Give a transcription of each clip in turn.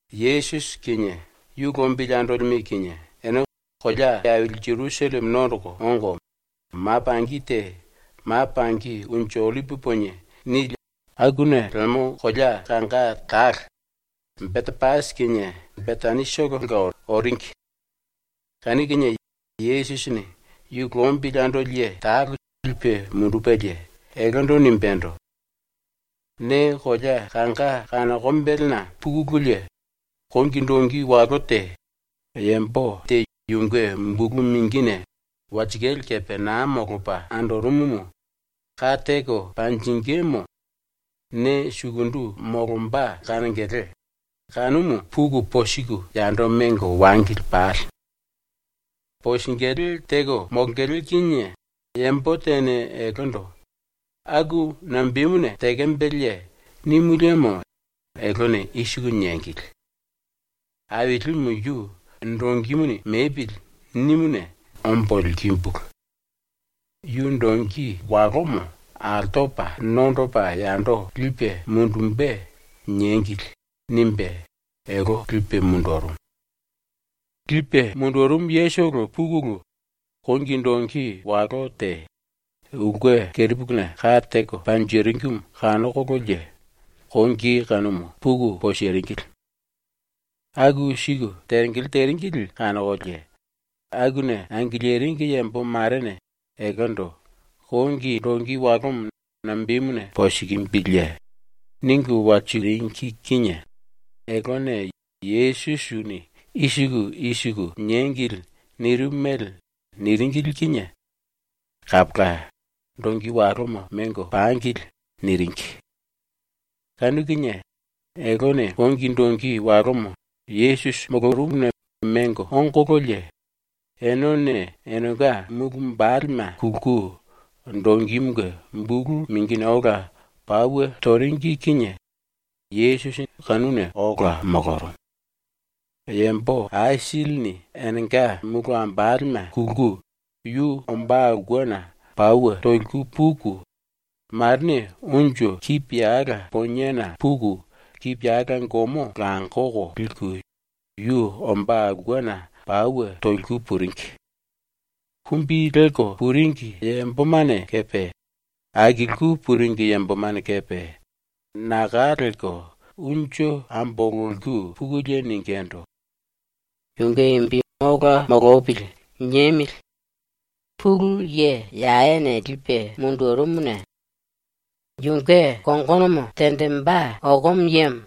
⸤Yesusi kinie yu lombili andolime kinie⸥ ene kolea aili Jerusalleme nondoko ongo, ma pangi te ‘Ma Pangi Unju Ollipi Ponie’ nili akuna lemo kolea kanga talo, Betepasi kinie Betanitolonga oringi. Kanu kinie Yesusini yu lombili andoli ye talo lipe mundupelie, eltendo nimbendo: “Ne kolea kanga kanokombelena pukululie kongi dongi walo te, yambo te yunge bulu mingine walsikale kepe naa molopa andorumumu ka teko panjingímu ne sukundu molomba kanongele, kanumu puku posiku yando mengo wangili pale. Posingilí teko molongele kinie yambo tene eltendo “Aku nambemuna tekembeleye?” nimu liemo eltene i siku niengili: “Ailimu yu ‘Dongimuni mepili.’ nimuna ombo likimbulu. Yu dongi walomo altopa nondopa yando lipe mundumbe.” niengili.” nimbe elte lipe mundurumu. Lipe mundurumu yetolo pukulu, kongi dongi walo te, ulke kerepuluna ka teko panjiringimu kanokololie kongi kanumu puku posiringili. Aku siku tengele teringili kanokolie akuna angiliringi yambo marene eltendo “Kongi dongi walomo nambemuna posikimbiliye?” ningu walsiku piliringi kinie eltene, Yesusini ‘i siku i siku niengili.’ nirimu mele niringili kinie “Kapola, ⸤dongi walomo⸥ mengo pangili.” niringi. Kanu kinie eltene kongi dongi walomo Yesusi molorumuna mengo ongololie, enene enenga mulu wambalema kulku dongimunge bulu mingine ola pauwe toringi kinie Yesusi kanuna ola molorumu. Yambo aisilini enenga mulu wambalema kulku yu ombá aulkena pauwe toliku puku, marene unju kipiyala poniena puku kipiyala gomo langoko liku yu ombá aulkena pauwe toliku puringi. Kumbi lelko puringi yambomane kepe akilku puringi yambomane kepe naka lelko unju ambololiku pukulie ningindu: “‘Yunge imbi ola molopili.’ niemili! ‘Pulu Ye Yawene lipe mundurumuna yunge kongonomo tenjimbe okomo yemo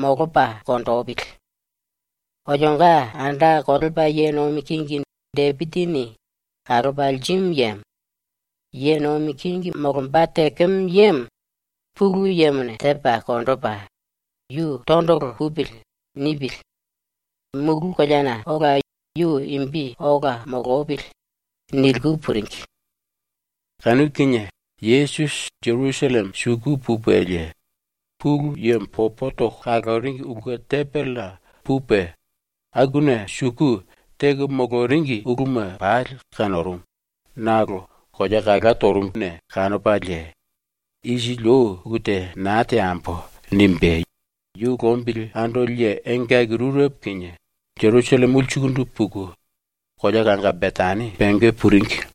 molopa konjipili!’ Olionga anda kolepa ye nomi kingi Depisi⸤ni kalopa lirimu yemo⸥ ye nomi kingi molomba tekemo yemo Pulu Yemone tepa konjipe ‘Yu tondolo pupili.’ nipili. Mulu koleana ola yu imbi ola molopili!” niliku puringi. Kanu kinie Yesusi Jerusalleme suku pupelie Pulu Yemo popo toko kaloringi ulke tembelena pupe akuna suku ⸤teko moloringi uluma⸥ pali kanorumu, nakolo kolea ipu lerimuna kanopalie ⸤‘Isili ou ulu te naa teambo.’ nimbe⸥ yu lombili andoli ye engaki rurepo kinie ⸤Jerusalleme⸥ ulsukundu puku, kolea kanga Betani ⸤pengé⸥ puringi.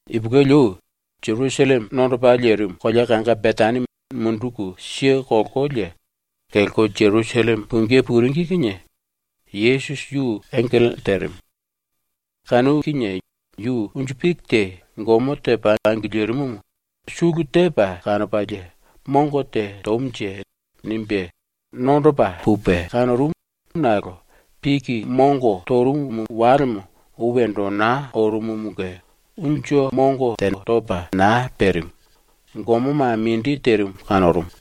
Ipulueli ou ⸤Jerusalleme nondopa lerimu⸥ kolea kanga Betani munduku kelkolie ⸤kelko Jerusalleme pungí puringi kinie⸥ Yesusi yu engele terimu. Kanu kinie yu unju piki te gomo tepa angilirimumu sulu tepa kanopalie ‘Mongo te tomunje.’ nimbe nondopa pupe kanorumu nakolo, piki mongo torumu walemo ou wendo naa orumumunge unju mongo topa te naa perimu, gomoma mindi terimu kanorumu.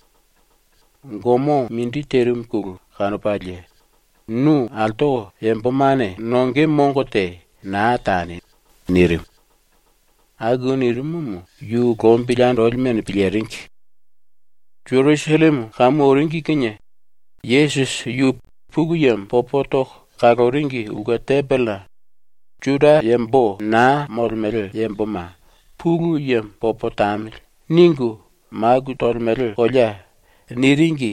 ⸤Gomo mindi terimuna⸥ kanopalie “Nu altoko yambomane nonge mongo te naa tani!” nirimu. Aku nirimumu yu lombili andolimene piliringi. Jerusalleme kamu oringi kinie Yesusi yu Pulu Yemo popo toko kaloringi ulke tembelena ⸤“Juda yambo naa molemele yamboma ‘Pulu Yemo popo tamili.’ ningu maku tolemele kolea” niringi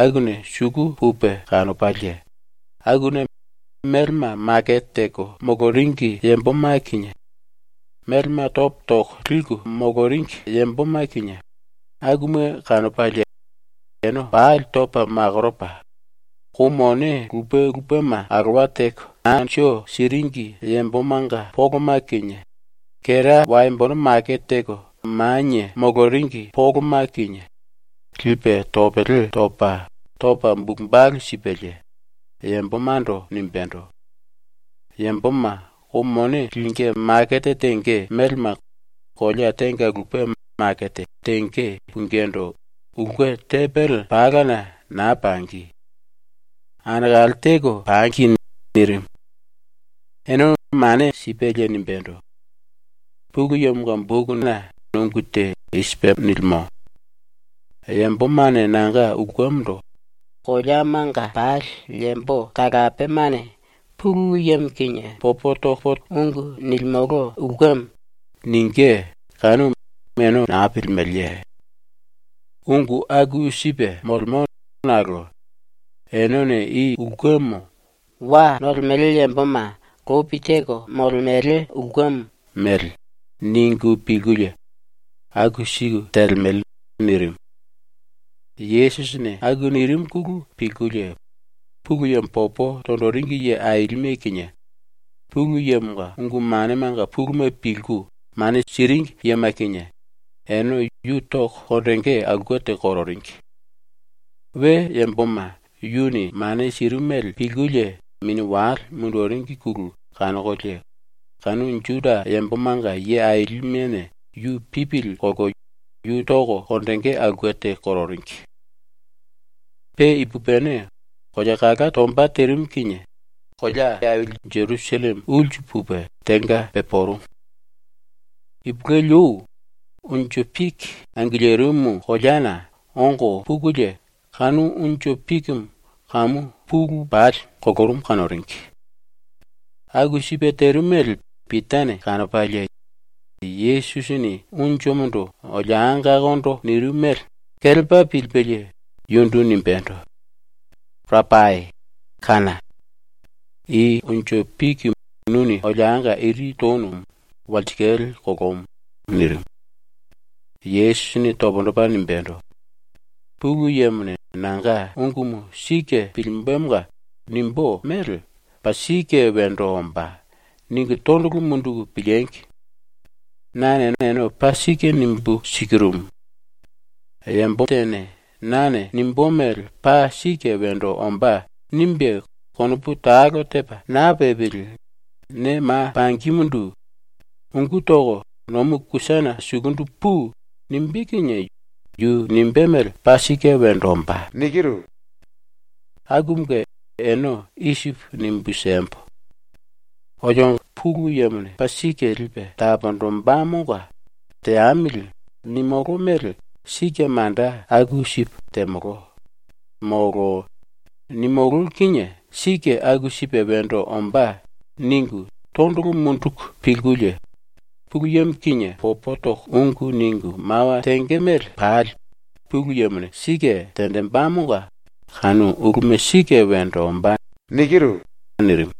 akuna⸥ suku pupe kanopalie akuna melema makete teko moloringi yamboma kinie, melema topo toko liku moloringi yamboma kinie, akuma kanopalie ene pali topa makoropa, kou mone lupe lupema alowa teko anju siringi yambomanga poloma kinie, kera waembono makete teko manie moloringi poloma kinie, lipe topele topa, topa bulu balu sipelie, yambomando nimbendo: “Yamboma kou mone lingí makete tenge melema kolea tenga lupe makete tenge pungindu ulke tembele palana naa pangi. ⸤Anekale teko pangi.⸥” nirimu. Ene mane sipelie nimbendo: “Pulu Yemonga bokuna ungu te i sipe nilimo: ‘Yambomane nanga ulkemondo “Koleamanga pali yambo talapemane Pulu Yemo kinie ungu nilimolo ulkemo.” ningí.’ kanumu ene naa pilimeleye? Ungu aku sipe molemo nakolo enene i ulkemo ‘wa nolemele yamboma lopi teko molemele ulkemo’ mele ningu pilkulie aku siku telemele.” nirimu. Yesusini aku nirimuna pilkulie Pulu Yemo popo tonjiringi ye ailime kinie, Pulu Yemonga ungu manemanga puluma pilku mane siringi yema kinie, ene yu toko konjingí aulke te kororingi. We yamboma yuni mane sirimu mele pilkulie mini wale munduringine kanokolie kanu Juda yambomanga ye ailimene yu pipili kolko yu toko konjingí aulke te kororingi. Pe ipupini, kolea kala tomba terimu kinie ⸤Jerusalleme⸥ ulsu pupe ⸤tenga pepurumu⸥. Ipulueli ou, ⸤unju piki angilirimu koleana⸥ ongo pukulie kanu unju pikimu kamu pulu pali kolorumu kanoringi. Aku sipe terimu mele Pitane kanopalie ⸤Yesusini unjumundu bonongokondo nirimu mele⸥ kelepa pilipelie yundu nimbendo: “Rapai, kána! I unju piki nuni ⸤bonongo⸥ iri tonumu ⸤walsikale⸥ kolomu.” nirimu. Yesusini pundu topa nimbendo: “Pulu Yemone nanga ungumu sike pilimbe⸤monga nimbú mele ‘Paa sike wendo ombá.’ ningu⸥ tondolo munduku piliengi! Nane ene paa sike nimbu sikirumu: Yambo tene ‘nane nimbú mele paa sike wendo ombá.’ nimbe konopu talo tepa naa pepili ne ma pangimundu “Ungú toko nomu kusana sukundu pui!” nimbé kinie yu nimbé mele paa sike wendo ombá. Akumunge ene i sipu nimbu siembo: ‘Olio ⸤Pulu Yemone paa sike lipe taponjimbemonga ‘Teamili.’ nimulú mele sike manda aku sipu temolo.’ molo ‘Nimulú kinie sike aku sipe wendo ombá.’ ningu⸥ tondolo munduku pilkulie Pulu Yemo kinie ungu ningu mawa tenge mele pali Pulu Yemone sike tenjimbemonga kanu uluma sike wendo ombá.” nirimu.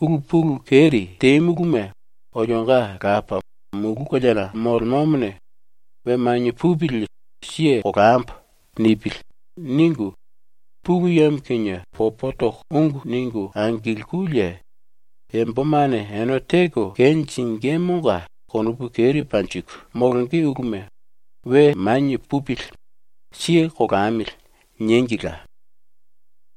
“‘Ulu pulu keri temuluma olionga Lapa, mulu koleana molemomone ‘We manie pupili, siye kolambo.’ nipili.’ ningu, Pulu Yemo kinie ungu ningu angilkulie yambomane ene teko kenjingímunge konopu keri panjiku molonge uluma ‘We manie pupili. Siye kolamili.’ niengila.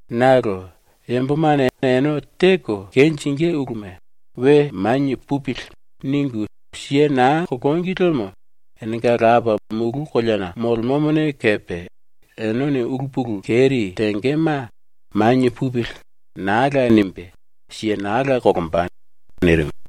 (Nakolo yambomane ene teko kenjingí uluma ‘We manie pupili.’ ningu siye naa kolongi liemo enenga Lapa, mulu koleana molemomone kepe enene ulu pulu keri tengema ‘Manie pupili.’ naa la nimbe siye naa la kolomba.)” nirimu.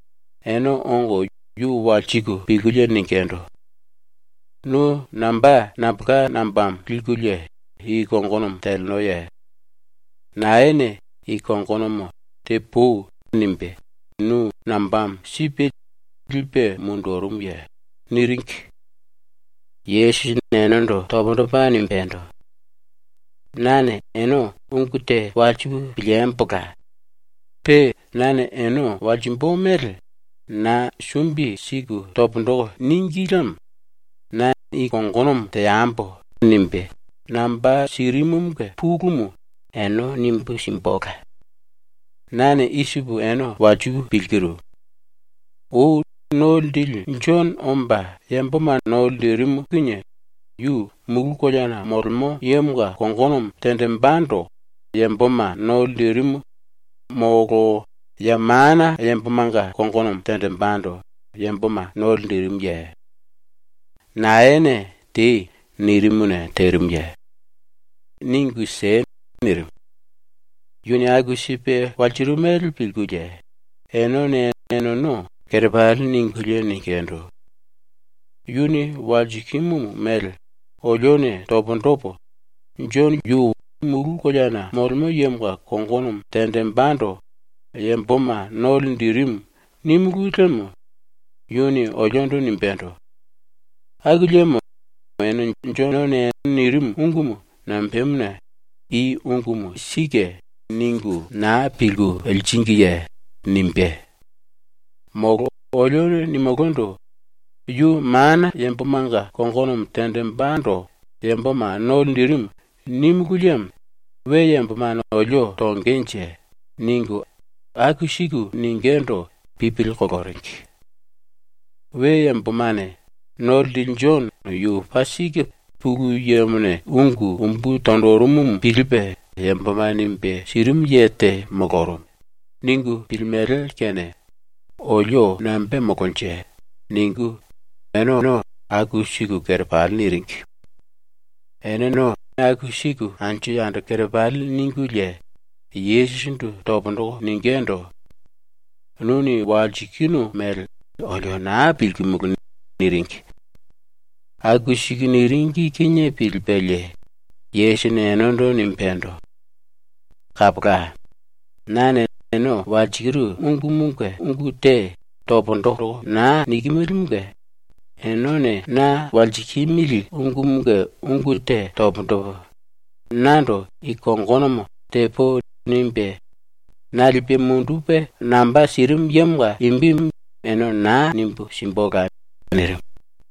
ene ongo yu walsiku pilkulie ningindu: “Nu namba nambolka nambamo likulie i kongonomo telenoye? Naene i kongonomo ‘Tepui.’ nimbe nu nambamo sipe lipe mundurumuye?” niringi. Yesusini enendo pundu topa nimbendo: “Nane ene ungu te walsipu piliembola. Pe nane ene walsimbu mele na sumbi siku pundu toko níngi liemo ‘Na i kongonomo teambo.’ nimbe namba sirimumunge pulumu ene nimbu simbula. ⸤Nane i sipu ene walsipu pilkiru:⸥ Ou ⸤No Linjili⸥ Jono omba yamboma no linjirimu kinie yu mulu koleana molemo yemonga kongonomo tenjimbendo yamboma no linjirimu molo ya mana yambomanga kongonomo tenjimbendo yamboma no linjirimuye? ⸤Naene “Tei.” nirimuna terimuye?⸥ Ningu siei.” nirimu. ⸤Yuni aku sipe walsirimu mele pilkulie⸥ enene eneno kerepali ningulie ningindu: “Yuni walsikimu mele olione pundu topo, ‘⸤Jono⸥ yu mulu koleana ⸤molemo yemonga kongono tenjimbendo yamboma no linjirimu⸥.’ nímulu liemo yuni oliondo nimbendo: ‘Aku liemo ene Jonone nirimu ungumu nambemuna ‘I ungumu sike.’ ningu naa pilku liringiye?’ nimbé. Molo olione nimulundu: ‘Yu mana yambomanga ⸤kongono tenjimbendo yamboma no linjirimu⸥.’ nímulu liemo we yambomane olio tongenje.” ningu aku siku ningindu pipili koloringi. “We yambomane ‘⸤No Linjili⸥ Jono yu paa sike Pulu Yemone ungu umbu tonjirimumu pilipe yamboma nimbe sirimu ye te molorumu.’ ningu pilimele kene olio nambe temolonje?” ningu eneno aku siku kerepali niringi. ⸤Eneno aku siku anju yando kerepali ningulie⸥, Yesusindu pundu toko ningindu: “⸤Nuni walsikinu mele⸥ olio naa pilkimulu.” niringi. Aku siku niringi kinie pilipelie Yesusini enendo nimbendo: “Kapola. ⸤Nane ene walsikiru ungumunge ungu te pundu toko naa nikimilimunge⸥ enene na walsikimili ungumunge ungu te pundu topo, nando i kongonomo ‘Tepui.’ nimbe na lipe mundupe namba sirimu yemonga imbimu ene naa nimbu simbula.” nirimu.